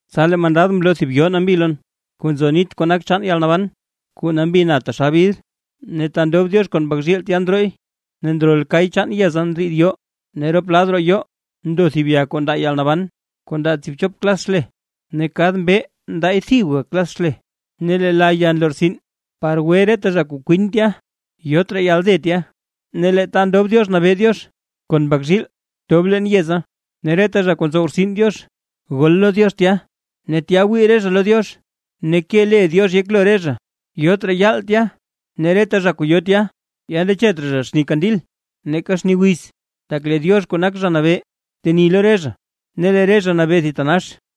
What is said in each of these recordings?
Tsa lee mandad mloo thib yoo nambi lon kuu nzo nit kuu nak chaan yalnaban. Kuu nambi na taxal bidr, ne ta ndob Diox kon Mbak zhiil tya ndrooy. Ne ndrol kay chaan yeza ndriid yoo, ne rop lad roo yoo, ndo thib ya kuu ndaa yalnaban, kuu ndaa tsiibchop klas xle ne kad mbee ndaay thibga klas xle. Ne lee la ya nlortsin par gwe reta zha kuu kwin tya. Yot raa yalde tya. Ne lee ta ndob Diox nabee Diox kon Mbak zhiil tob leen yeza, ne reta zha kuu ntsow rtsin Diox gol lo Diox tya. Ne tya wii re zha lo Diox ne ke le Diox yeklo re zha. Yot raa yaal tya; ne reta zha kuu yo tya, ya nandechet raa zha xni kandil, neeka xni wiz; tak lee Diox kuu nak Zha Nabee teni lo re zha, ne lee re zha nabee thitanax.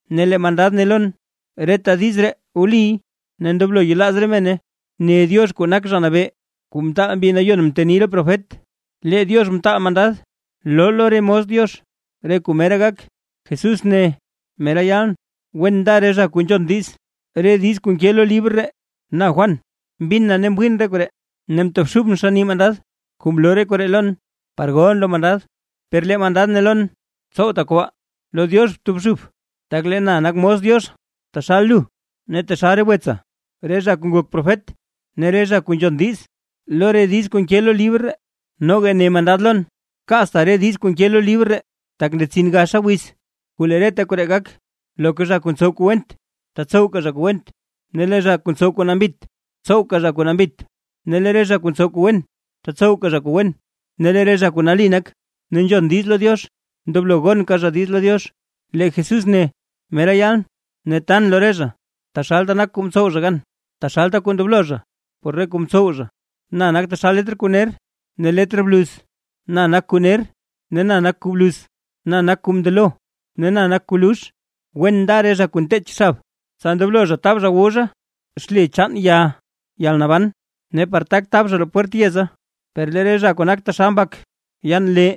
Ne lee mandad ne lon: ―Reta diiz ree wliy ne ndoblo yelaaz re mene. Ne Diox kuu nak Zha Nabee, kuu mtaal Mbi Nayon mteni re profet, lee Diox mtaal mandad loo lo re mos Diox re kuu mera gak. Jesús ne: ―¡Mera yalʼn! ¡Wen nda re zha kuu nzhon diiz, re diiz kuu nke lo libr ree! Na Juan, mbin na ne mwiin re koree, ne mtobxubʼn xann nii mandad kuu mloo re koree lon, par golʼn lo mandad. Per lee mandad ne lon: ―Tsowta kobaa. ¡Lo Diox btobxub! Tak lee na nakʼn mos Diox taxal lu ne taxal re wetsa, re zha kuu ngok profet ne reta zha kuu nzhon diiz lo re diiz kuu nke lo libr ree. Noga ne mandad lon: ―Kaatsta re diiz kuu nke lo libr ree, tak ndetsin gaxa wiz kuu lee reta koree gak. Loka zha kuu ntsow kuu went, tatsowka zha kuu went, ne lee re zha kuu ntsow kuu nambit, tsowka zha kuu nambit; ne lee re zha kuu ntsow kuu wen, tatsowka zha kuu wen, ne lee re zha kuu nali nak ne nzhon diiz lo Diox, ndoblo gonka zha diiz lo Diox. Lee Jesús ne: ―¡Mera yalʼn! Ne tan lo re zha taxalta kuu mtsow zha gan, taxalta kuu ndoblo zha por re kuu mtsow zha. Na nak taxal letr kuu ner ne letr bluz, na nak kuu ner ne na nak kuu bluz, na nak kuu mndelo ne na nak kuu luux. ’Wen nda re zha kuu nteech xab, tsa ndoblo zha tab zha wu zha xle chaan ya yalnaban, ne par tak tab zha roo pwert yeza. Per lee re zha kuu nak taxal mbak yaan lee;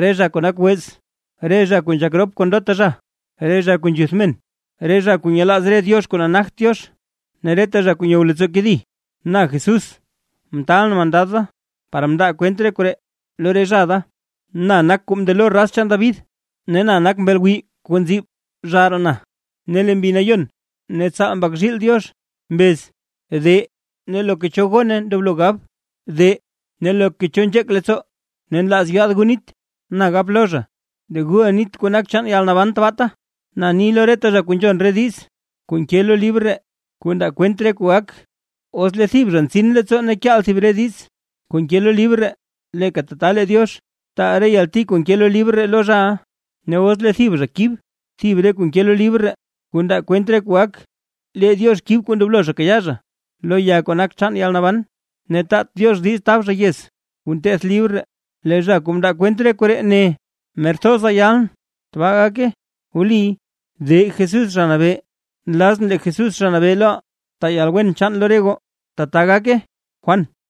re zha kuu nak wez, re zha kuu nzhak rop kon ndota zha, re zha kuu nzhuth men, re zha kuu nyelaaz re diox kuu nagt Diox, ne reta zha kuu nyow leettsoo kedi. ’Na Jesús mtaalʼn mandad da, par mndaa kwent re koree lo re zha da. Na nak kuu mndelo raz chaan David, ne na nak mbel gwiiy kuu nziib zhaaraa na. Ne lee Mbi Nayon ne tsaal Mbak zhiil Diox mbez: ―De. Ne loka cho gone ndoblo gab: ―De. Ne loka cho nzheek leettsoo ne nlaaz yaad gu nit, na gap lo zha: ―De, guʼa nit kuu nak chaan yalnaban tbaata. Na ni lo reta zha kuu nzhon re diiz kuu nke lo libr ree, kuu ndaa kwent re kuu gak: Os lee thib zha ntsin leettsoo ne kyaal zha thib re diiz kuu nke lo libr ree, leeka tata lee Diox taal re yalti kuu nke lo libr ree lo zhaʼa. Ne os lee thib zha kib thib re kuu nke lo libr ree, kuu ndaa kwent re kuu gak, lee Diox kib kuu ndoblo zha kayaa zha lo ya kuu nak chaan yalnaban, ne taat Diox diiz tab zha yez kuu nteth libr ree. Lee zha kuu mndaa kwent re koree, ne: ―¡Mer thoza yalʼn! ¡Tbaa gake! ¡De Jesús, Zha Nabee! Nlazʼn lee Jesús Zha Nabee loʼaa taa yalwen chaan lo re goo. ¡Tbaa gake! Juan